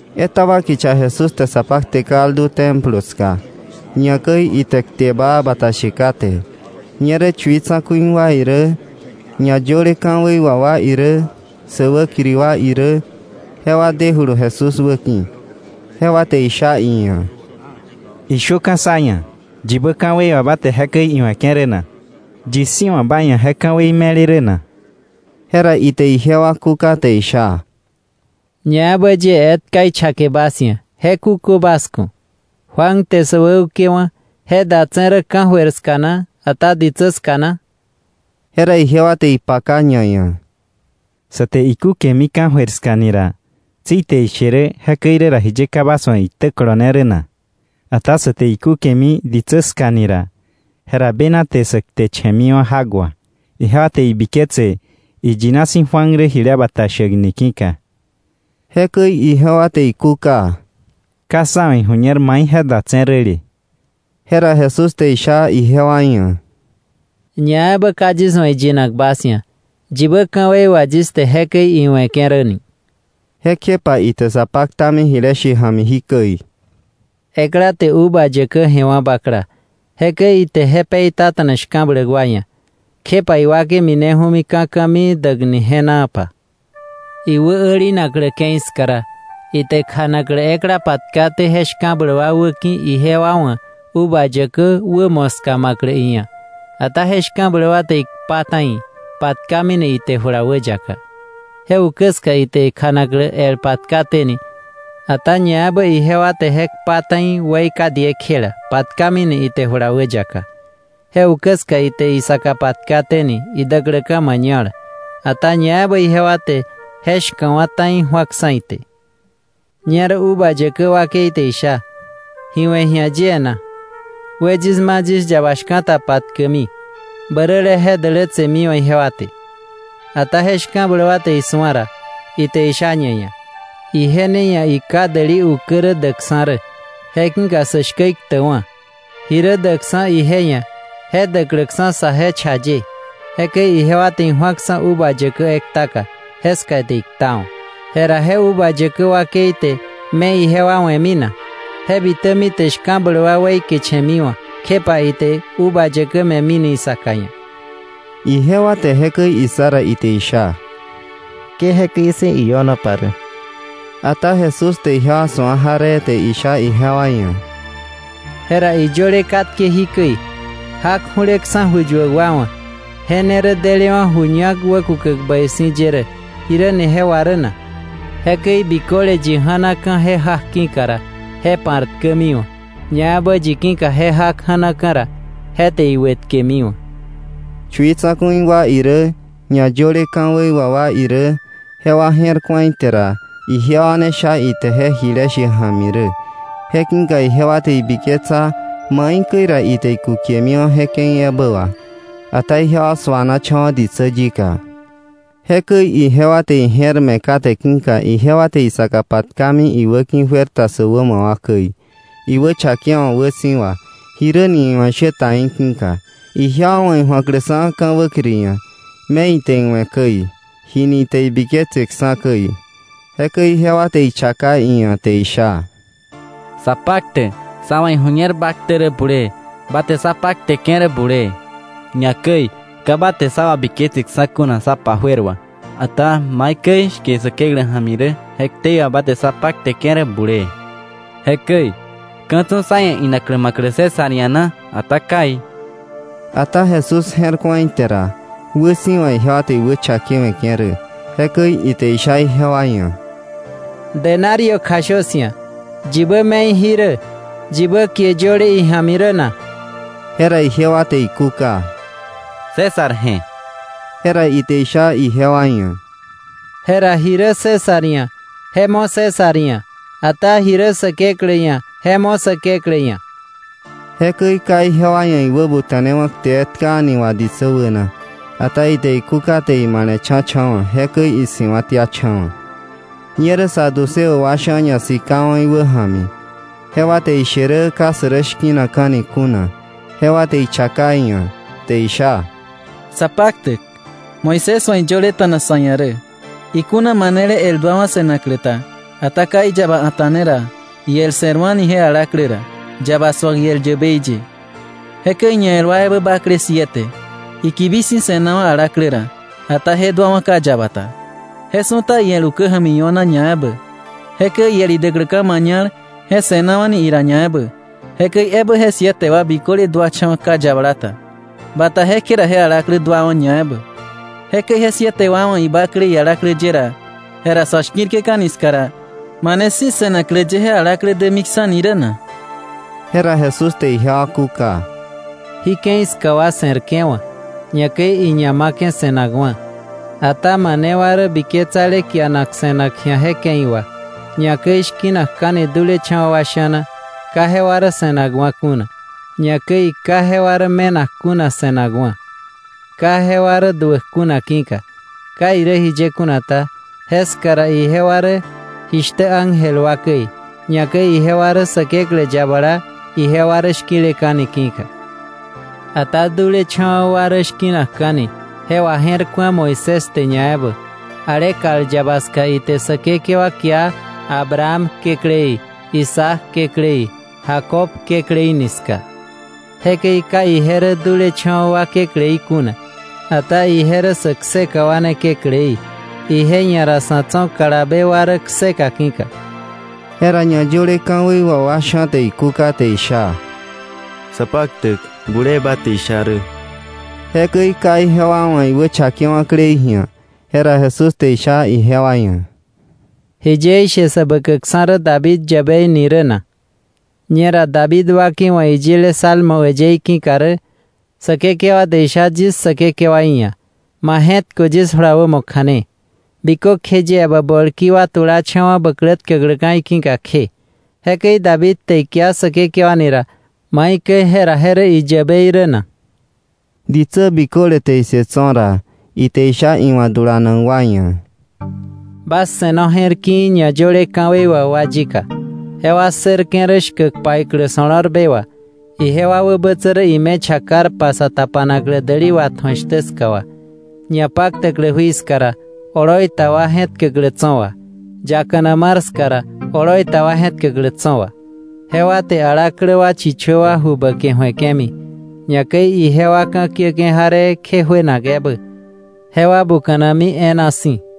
Etaba kicha Jesús te sa pakte kaldu Templo ska, ñakäi ite kte baa bata she kate. Ñerä chui tsa̱ku̱i wa irä, ñayöle ka̱wei wà wa irä, sä wäkiri wa irä jewa demijulu Jesús wäki̱. Jewa te isha iia̱: —Ishöka̱ sá ia̱, ¿yibä ka̱wei wà ba te jekäi iwe̱ke̱ rä na? ¿Yi si̱ wa̱ ba ia̱ je ka̱wei me̱le rä na? Jera ite ijewa kúka te isha: —Ñaebä yie etka ichake bas ia̱, je kukö bas ku̱. Juan te sä wäukewa̱, ¿je datse̱ rä ka̱jöir ska na, ata ditsä ska na? Jera ijewa te ipaka ñaia̱: “Sa te ikúkemi ka̱jöir ska ni ra, tsi ite ishe rä: ‘Jekäi irä ra, ¿jiye ka bas wa̱ iktä kolone rä na?’ Ata sä te ikúkemi ditsä ska ni ra, jera bena te sä kteche̱miwa̱ jak wà, ijewa te ibiketse iyina si̱ Juan rä jile bata shäk ni ki̱ka.” Jekäi ijewa te ikúka: —Ka sá wa̱ iju̱ñer mai je datse̱ räle. Jera Jesús te isha ijewa ia̱: —Ñaebä ka yis wa̱ iyinak bas ia̱, yibä ka̱wei wà yis te jekäi iwe̱ke̱ rä ni. Jekjepa ite sa paktami jile she ja̱mi jikäi: “Ekla te uva yäkä je̱wa̱ bakla, jekäi ite je peitata̱na shka̱bläk wa ia̱, kjepa iwakei mineju̱mi ka̱ ka̱mii däkni je̱naapa. Iwä älinaklä ke̱i ska ra, ite kjanaklä ekla patkaté je shka̱bläk wa wäki̱ ijewa wa̱ uva yäkä wä moska ma̱klä iia̱. Ata je shka̱bläk wa te ikpa ta̱i, patkamini ite jula wäyaka. Je ukä ska ite kjanaklä el patkaténi, ata ñaebä ijewa te je kpa ta̱i weika diekjela, patkamine ite jula wäyaka. Je ukä ska ite isaka patkaténi idäkläka̱ mañal, ata ñaebä ijewa te je shka̱wa̱ ta̱i ju̱aksa̱ ite. “Ñerä uva yäkä wakei te isha: ‘¿Ji we̱ ji̱a yie na? Wë yis ma yis yaba shka̱ta patkäkmi, bäräle je dälätsemiwa̱ ijewa te.’ Ata je shka̱bläk wa te isu̱a ra, ite isha ñaia̱: ‘Ije ne ia̱ iká däli ukä rä däkksa̱ rä; je ki̱ka sä shkä iktäkwa̱, ji rä däkksa̱ ije ia̱ je däkläksa̱ saje cha ye.’ Jekäi ijewa te iju̱aksa̱ uva yäkä ektaka, jeska ite iktawa̱. “Jera ¿je uva yäkä wakei te me ijewa we̱mi na? Je bitämi te je shka̱bläk wa weikeche̱miwa̱, kjepa ite uva yäkä me̱mini isaka ia̱.” Ijewa te jekäi issa ra, ite isha: —¡Ke jekäi si̱ io̱nopa rä! Ata Jesús te ijewa su̱a jaree te isha ijewa ia̱: —Jera iyöle katke jikäi: ‘Jak ju̱leksa̱ ju yuäk wa wa̱, je ne rä delewa̱ ju ñak wäkukäk bäi si̱ ye rä’, ¿jiräni je wà rä na? Jekäi biköle yi ja̱naka̱ je jak ki̱ka ra, je pa̱rtkämiwa̱; ñaebä yi ki̱ka je jak ja̱naka̱ ra, je te iwëtkemiwa̱. Chui wa tsa̱ku̱i wa irä ñayöle ka̱wei wà wa irä jewa je̱r ku̱a ite ra, ijewa ne sha ite je jile she ja̱mi rä, je ki̱ka ijewa te ibiketsa maikäi ra ite ikukemiwa̱ je ke̱i ebä wà. Ata ijewa suanacha̱wa̱ ditsä yika. Jekäi ijewa te ije̱r me̱ kate ki̱ka ijewa te isaka patkami iwäki̱, juer ta sä wämo wa käi, iwächakewa̱k wäsi̱wa, jiräni iwa̱ ishä ta í̱ ki̱ka, ijewa wa̱ iju̱akläksa̱ ka̱ wäkiri ia̱, me ite iwe̱ käi, jini ite biketseksa̱ käi. Jekäi ijewa te ichaka iia̱ te isha: —Sapaktäk, sá wa̱ iju̱ñer ba ktä rä bulee, ba te sa pakteke̱ rä bulee, ñakäi ka ba te sa wabiketseksa̱ kuna sa pa juer wà, ata maikäi shke Säkeklä ja̱mi rä je ktei wà ba te sa pakteke̱ rä bulee. Jekäi ¿ka̱ tso̱ sá ia̱ inaklä ma̱klä César ia̱ na, ata kai? Ata Jesús je̱r ku̱a ite ra, wäsi̱wa ijewa te iwächakewe̱ke̱ rä, jekäi ite isha ijewa ia̱: —‘Denario kjashö 'sia̱.’ ¿Yibä me̱i jí rä, yibä kie yöle ija̱mi rä na? Jera ijewa te ikúka: —César je̱. Jera ite isha ijewa ia̱: —Jera ji rä César ia̱, je mo César ia̱, ata ji rä Säkeklä ia̱, je mo Säkeklä ia̱. Jekäi ka ijewa ia̱ iwäbuta̱newa̱ kte etka a̱ni wà ditsä wäna, ata ite ikúka te imale̱cha̱cha̱wa̱, jekäi isi̱wa̱tiacha̱wa̱. Ñerä saduceo wa sha̱ ñasikawa̱ iwä ja̱mi. Jewa te ishe rä ka sä rä shki̱nakka̱ni kuna; jewa te ichaka iia̱, te isha: —Sapaktäk, Moisés wa̱ iyöleta̱na sa̱ ia̱ rä: Ikuna manele el duawa̱ se̱naklä ta, ata ka iyaba a̱ta̱neta̱na ra, iel se̱rwa̱ni je alaklä ra, yaba su̱ak iel yäbei ye. Jekäi ñael wa ebä bakle siete; ikibi si̱ se̱nawa̱ alaklä ra, ata je duawa̱ ka yaba ta. Je su̱ta iel ukä ja̱mi io̱na ñaebä. Jekäi iel idäkläka̱ mañal je se̱nawa̱ ira ñaebä. Jekäi ebä je siete wa biköle duacha̱wa̱ ka yabala ta; bata jekje ra je alaklä duawa̱ ñaebä. Jekäi je siete wa wa̱ ibakle ialaklä ye ra, jera sa̱ shki̱rke̱ka̱ni ska ra, ¿mane si̱ se̱naklä ye je alaklä dämiksa̱ni rä na? Jera Jesús te ijewa kúka: —Jí ke̱i ska wa se̱rke̱wa̱, ñakäi iña ma̱ke̱ se̱nakwa̱. Ata mane wa rä biketsale kianak se̱nak ji̱a je ke̱i wà, ñakäi shki̱nakka̱ni dulecha̱wa̱ wa sha̱na, ka jewa rä se̱nakwa̱ kuna, ñakäi ka jewa rä me̱nak kuna se̱nakwa̱, ka jewa rä duäk kuna ki̱ka. Ka irä jiye kuna ta, jeska ra ijewa rä jishtä ángel wa käi, ñakäi ijewa rä Säkeklä yabala ijewa rä shki̱leka̱ni ki̱ka. Ata dulecha̱wa̱ wa rä shki̱nakka̱ni je waje̱rku̱a Moisés te ñaebä, ale kal yaba ska ite Säkekewa kia Abraham Kekläí, Isaac Kekläí, Jacob Kekläí ni ska. Jekäi ka ije rä dulecha̱wa̱ wa Kekläí kuna, ata ije rä sä kseka wa ne Kekläí, ije ia̱ ra sa̱ tso̱ kalabe wa rä kseka ki̱ka. Jera ñayöle ka̱wei wà wa sha̱ te ikúka te isha: —Sapaktäk, bulee ba te isha rä. Jekäi ka ijewa wa̱ iwächakewa̱klei ji̱a. Jera Jesús te isha ijewa ia̱: —¿Jiye ishe sä bäkäkksa̱ rä David yäbei ni rä na? Ñera David wakeiwa̱ iyile Salmos äyëí ki̱ka rä: “Säkekewa te isha yis Säkekewaí ia̱: Ma je̱tköwa̱ yis jula wämo kja̱ne, bikökje yie bä bolki wa tulacha̱wa̱ bä klä tkäkläka̱ iki̱ka kje.” Jekäi David te ikia Säkekewa ni ra, ¿maikäi jera je rä iyäbei rä na? Ditsä biköle te issë tso̱ ra, ite isha iwa̱ dulanak wa ia̱: “Bas se̱no je̱r ki̱i̱ ñayöle ka̱wei wà wa yika. Jewa ssërke̱ rä shkäk paiklä so̱lo̱rbe wà, ijewa wäbätsä rä ime chakarpa sa tapanaklä däli watju̱ak shtä ska wà, ñapaktäklä jui ska ra, oloi ta wa je̱tkäklä tso̱ wà, yakana mar ska ra, oloi ta wa je̱tkäklä tso̱ wà. Jewa te alaklä wa chichö wa ju bäke ju̱eke̱mi, ñakäi ijewa ka̱kiäke̱ jaree kje juenak ebä. Jewa buka̱nami e̱e̱na si̱.”